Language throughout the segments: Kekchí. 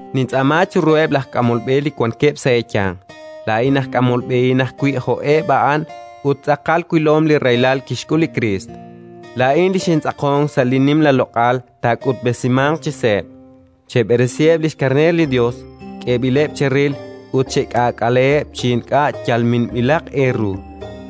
Nintz'aama chiruheb' laj k'amol b'e li wankeb' sa' eeyanq, laa'in aj k'amol b'ehin ajwi' jo'eb' a'an ut tz'aqal wilom li rahilal kixk'ul li Kriist, laa'in li xintz'aqonk sa' li nimla loq'al taak'utb'esimanq chi seeb': cheberesiheb' li xkarneer li Yos k'eeb'ileb' cheril ut chek'aak'aleheb' chi ink'a' yal minb'ilaq eeru,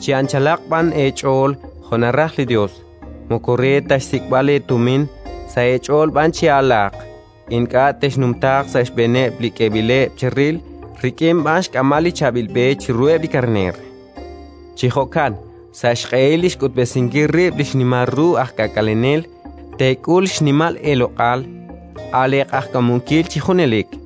chi anchalaq b'an eech'ool jo' naraj li Yos; moko re ta xsik'b'al eetumin, sa' eech'ool b'an chi'alaaq; ink'a' texnumtaaq sa' xb'eeneb' li k'eeb'ileb' cheril, rik'in b'an xk'amb'al li chaab'il b'e chiruheb' li karneer. Chi jo'kan, sa' xq'ehil li xk'utb'esinkil rib' li xnimal ru aj K'aak'alenel, teek'ul xnimal eeloq'al, a' leeq'ajkamunkil chi junelik.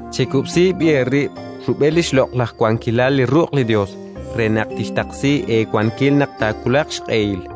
Chekub'si b'i' eerib' rub'el li xloq'laj wankilal li ruq' li Yos, re naq tixtaqsi eewankil naq taawulaq xq'ehil.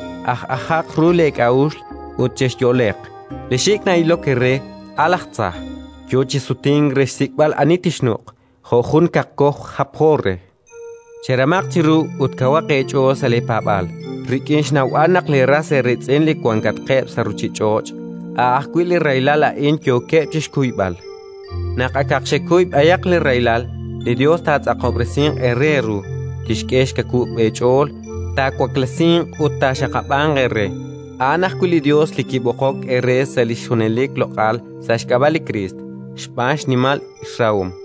Aj'ajaq ru leek'a'uxl ut chexyo'leq! Li xik' na'ilok eere, a' laj tza, yo chi sutink re xsik'b'al ani tixnuq', jo' jun kaqkoj japjo re. Cheramaq chiru ut kawaq eech'ool sa' leepaab'aal, rik'in xnawb'al naq leeras eeriitz'in li wankatqeb' sa' ruuchich'och', a' ajwi' li rahilal a'in yookeb' chi xkuyb'al. Naq akaq xekuy b'ayaq li rahilal, li Yos taatz'aqob'resinq eere eeru, tixk'e xkawub' eech'ool, taawaklesinq ut taaxaqab'anq eere. A'an ajwi' li Yos li kib'oqok eere sa' li xjunelik loq'al sa' xk'ab'a' li Kriist, xb'aan xnimal xrahom.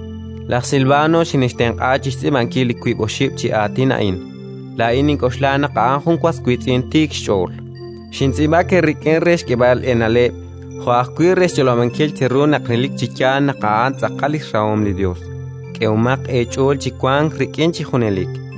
Laj Silvano xinxtenq'a chi xtz'iib'ankil li wib' oxib' chi aatin a'in; laa'in nink'oxla naq a'an jun was wiitz'in tiik xch'ool. Xintz'iib'ak eerik'in re xk'eeb'al eena'leb' jo' ajwi' re xch'olob'ankil cheru naq relik chi yaal naq a'an tz'aqal li xrahom li Yos. K'ehomaq eech'ool chi wank sa' li xrahom chi junelik.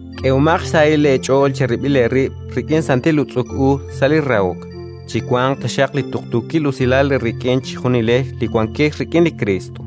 K'ehomaq xsahil eech'ool cherib'il eerib' rik'in santil utz'uk u sa' li rahok. Chiwanq taxaq li tuqtuukil usilal eerik'in chejunilex li wankex rik'in li Kriist.